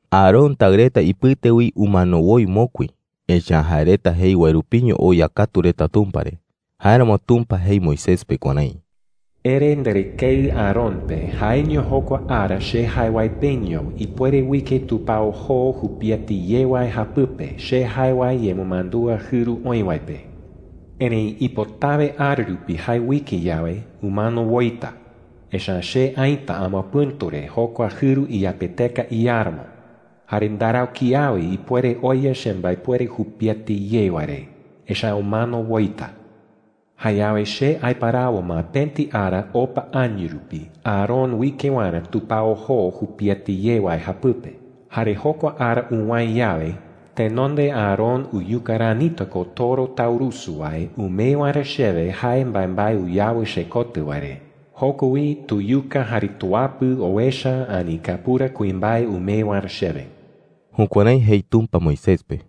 Aarón taɨ reta ipɨte wi umano woi mokui, echa’ä jae reta jei wae rupiño oya katu reta Tumpa re. Jáeramo Tumpa jei Moisés pe kuärái: “Ere nderɨkeɨ Aarón pe jaeño jokua ara che jae wae peño ipuere uike tupao joo jupiete ye wae japɨpe che jae wae yemɨmandúa jɨru oï wae pe,” jei. “Erëi ipotawe ara rupi jae uike yawe, umano woita, echa’ä che aïta amapɨ̈tu re jokua jɨru iyapeteka iáramo. Jare ndarau kiawe ipuere oya chembaepuere jupiete ye wae re, echa’ä umano woita,” jei. “Jayawe che aiparawo ma pëti ara opa año rupi Aarón uike waerä tupao joo jupiete ye wae japɨpe. Jare jokua ara uwäe yawe, tenonde Aarón uyuka ranita ko toro taurusu wae umee waerä chewe jae mbaembae uyawɨ chekotɨ wae re. Joko wi tuyuka jare tuapɨ owecha ani kapura kuimbae umee waerä chewe.” Jukuärái jei Tumpa Moisés pe.